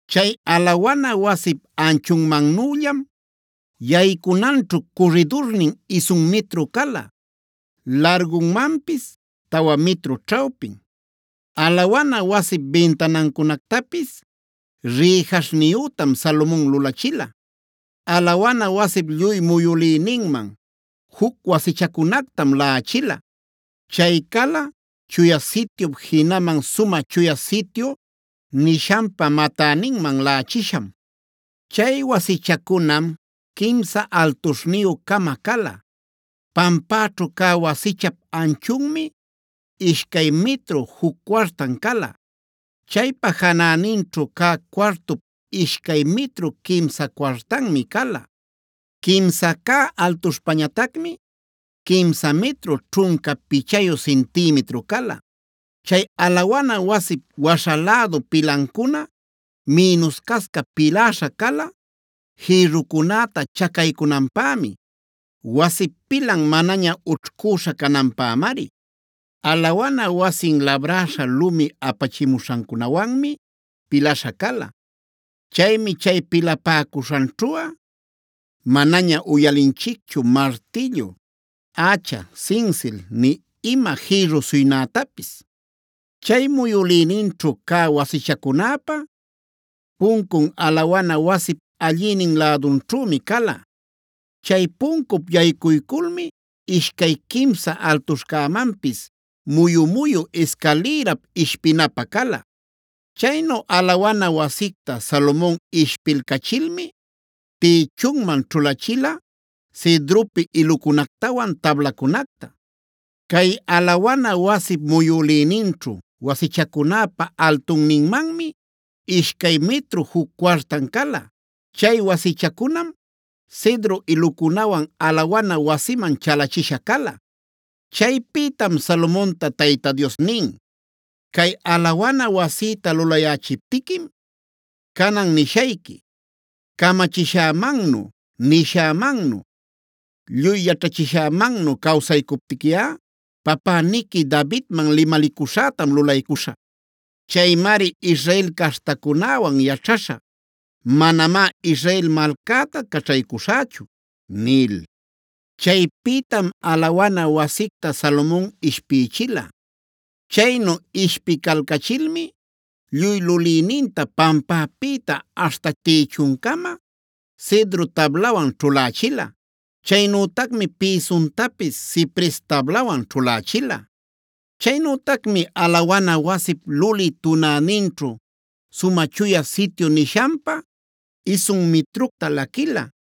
Chay alawana wasip anchunmannüllam yaycunanćhu curridurnin isun mitru cala, largunmanpis tawa mitru ćhawpin. Alawana wasip bintanancunactapis rïjaśhniyütam Salomon lulachila. Alawana wasip lluy muyülïninman juc wasichacunactam laꞌachila. Chay cala Chuya Sityup jinaman Sumä Chuya Sityu nishanpa matäninman laꞌachisham. Chay wasichacunam quimsa altuśhniyü-cama cala. Pampäćhu cä wasichap anchunmi ishcay mitru juc cuartan cala. Chaypa janäninćhu cä cuartup ishcay mitru quimsa cuartanmi cala. Quimsa cä altuśhpañatacmi quimsa mitru ćhunca pichayu cintimitru cala. Chay alawana wasip waśha lädu pilancuna mïnuscasca piläśha cala jïrrucunäta chacaycunanpämi; wasip pilan manaña ućhcuśha cananpämari. Alawana wasin labräśha lumi apachimuśhancunawanmi pilaśha cala. Chaymi chay pilapäcuśhanćhuꞌa manaña uyalilanchicchu martillu, ächa, sinsil, nï ima jïrru suynätapis. Chay muyülïninćhu cä wasichacunäpa puncun alawana wasip allïnin lädunćhümi cala. Chay puncup yaycuyculmi ishcay, quimsa altuśhcämanpis muyu-muyu iscalïrap ishpinapä cala. Chaynu alawana wasicta Salomon ishpilcachilmi tïchunman ćhulachila cedropi ilucunactawan tablacunacta. Cay alawana wasip muyülïninćhu wasichacunäpa altunninmanmi ishcay mitru juc cuartan cala. Chay wasichacunam cedro ilucunawan alawana wasiman chalachisha cala. Chaypïtam Salomonta Tayta Dios nin: “Cay alawana wasïta lulayächiptiquim canan nishayqui: camachishämannu, nishämannu, lluy yaćhachishämannu cawsaycuptiquiꞌa papäniqui Davidman limalicuśhätam lulaycuśhä. Chaymari Israel caśhtacunäwan yaćhaśhä; manamá Israel malcäta caćhaycuśhächu” nil. Chaypïtam alawana wasicta Salomon ishpïchila. Chaynu ishpicalcachilmi lluy lulïninta pampäpïta aśhta tïchuncama cedro tablawan ćhulächila. Chaynütacmi pïsuntapis cipres tablawan ćhulächila. Chaynütacmi alawana wasip lulï tunäninćhu Sumä Chuya Sityu nishanpä isun mitructa laquila.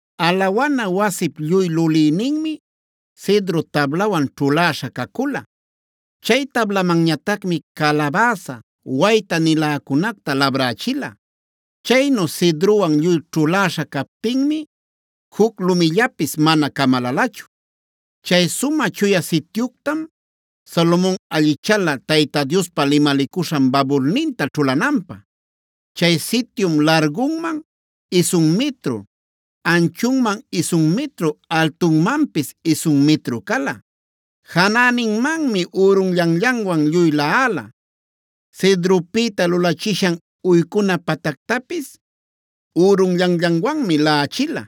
Alawana wasip lluy lulïninmi cedro tablawan ćhuläśha cacula. Chay tablamanñatacmi calabäsa, wayta-niläcunacta labrächila. Chaynu cedrowan lluy ćhuläśha captinmi juc lumillapis mana camalalachu. Chay Sumä Chuya Sityuctam Salomon allichala Tayta Diospa limalicuśhan babulninta ćhulananpä. Chay sityum largunman isun mitru, anchunman isun mitru, altunmanpis isun mitru cala. Janäninmanmi ürunllanllanwan lluy laꞌala. Cedropïta lulachishan uycuna patactapis ürunllanllanwanmi laꞌachila.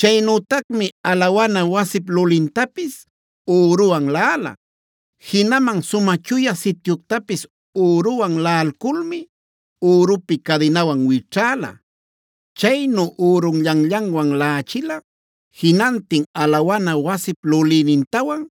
Chaynütacmi alawana wasip lulintapis üruwan laꞌala. Jinaman Sumä Chuya Sityuctapis üruwan laꞌalculmi ürupi cadinawan wićhäla. Chaynu ürunllanllanwan laꞌachila jinantin alawana wasip lulïnintawan,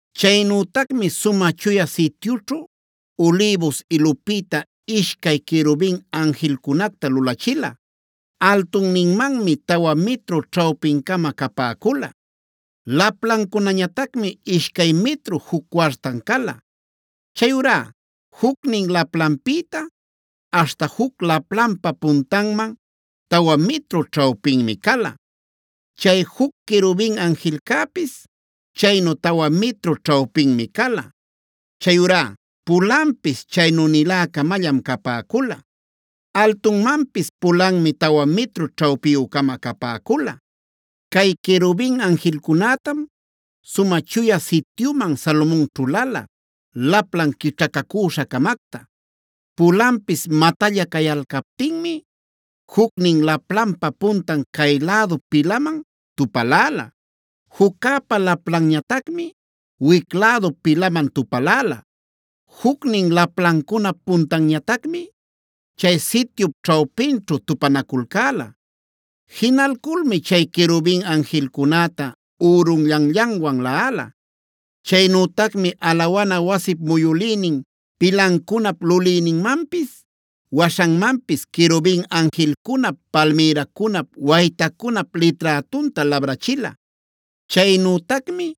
Chaynütacmi Sumä Chuya Sityućhu ulïbus ilupïta ishcay querubin anjilcunacta lulachila. Altunninmanmi tawa mitru ćhawpin-cama capäcula. Laplancunañatacmi ishcay mitru juc cuartan cala. Chayurá jucnin laplanpïta aśhta juc laplanpa puntanman tawa mitru ćhawpinmi cala. Chay juc querubin anjilcäpis chaynu tawa mitru ćhawpinmi cala. Chayurá pulanpis chaynü-nilä-camallam capäcula. Altunmanpis pulanmi tawa mitru ćhawpiyü-cama capäcula. Cay querubin anjilcunätam Sumä Chuya Sityuman Salomon ćhulala laplan quićhacacüśha-camacta. Pulanpis matalla cayalcaptinmi jucnin laplanpa puntan cay-lädu pilaman tupaläla. Juccäpa laplanñatacmi wic lädu pilaman tupaläla. Jucnin laplancunap puntanñatacmi chay sityup ćhawpinćhu tupanaculcäla. Jinalculmi chay querubin anjilcunäta ürunllanllanwan laꞌala.c Chaynütacmi alawana wasip muyülïnin pilancunap lulïninmanpis waśhanmanpis querubin anjilcunap, palmïracunap, waytacunap liträtunta labrachila. Chaynütacmi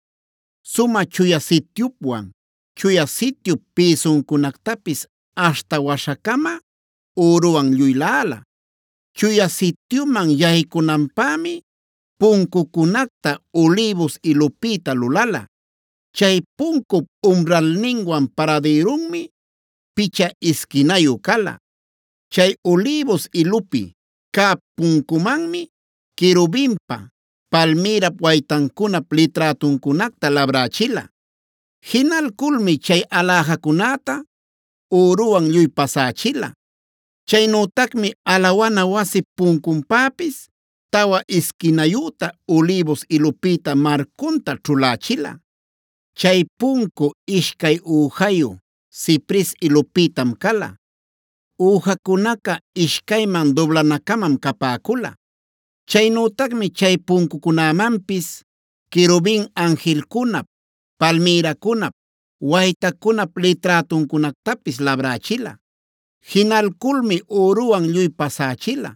Sumä Chuya Sityupwan Chuya Sityup pïsuncunactapis aśhta waśhacama üruwan lluy laꞌala. Chuya Sityuman yaycunapämi puncucunacta ulïbus ilupïta lulala. Chay puncup umralninwan paradïrunmi picha isquinayu cala. Chay ulïbus ilupi cä puncumanmi querubinpa, palmïrap, waytacunap liträtuncunacta labrächila. Jinalculmi chay aläjacunäta üruwan lluy pasächila. Chaynütacmi alawana wasip puncunpäpis tawa isquinayüta ulïbus ilupïta marcunta ćhulachila. Chay puncu ishcay üjayu cipres ilupïtam cala; üjacunaca ishcayman dublana-camam capäcula. Chaynütacmi chay puncucunämanpis querubin anjilcunap, palmïracunap, waytacunap liträtuncunactapis labrächila. Jinalculmi üruwan lluy pasächila.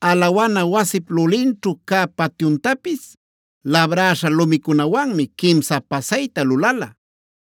Alawana wasip lulinćhu cä patyuntapis labräśha lumicunawanmi quimsa pasayta lulala.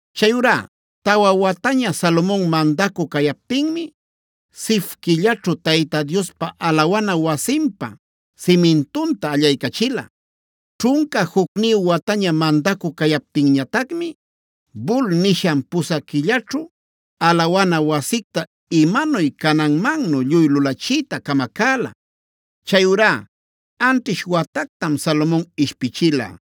Chayurá tawa wataña Salomon mandacü cayaptinmi, Zif quillaćhu Tayta Diospa alawana wasinpa simintunta allaycachila. Ćhunca jucniyu wataña mandacü cayaptinñatacmi Bul nishan pusä quillaćhu alawana wasicta imanuy cananmannu lluy lulachiyta camacäla. Chayurá anćhish watactam Salomon ishpichila.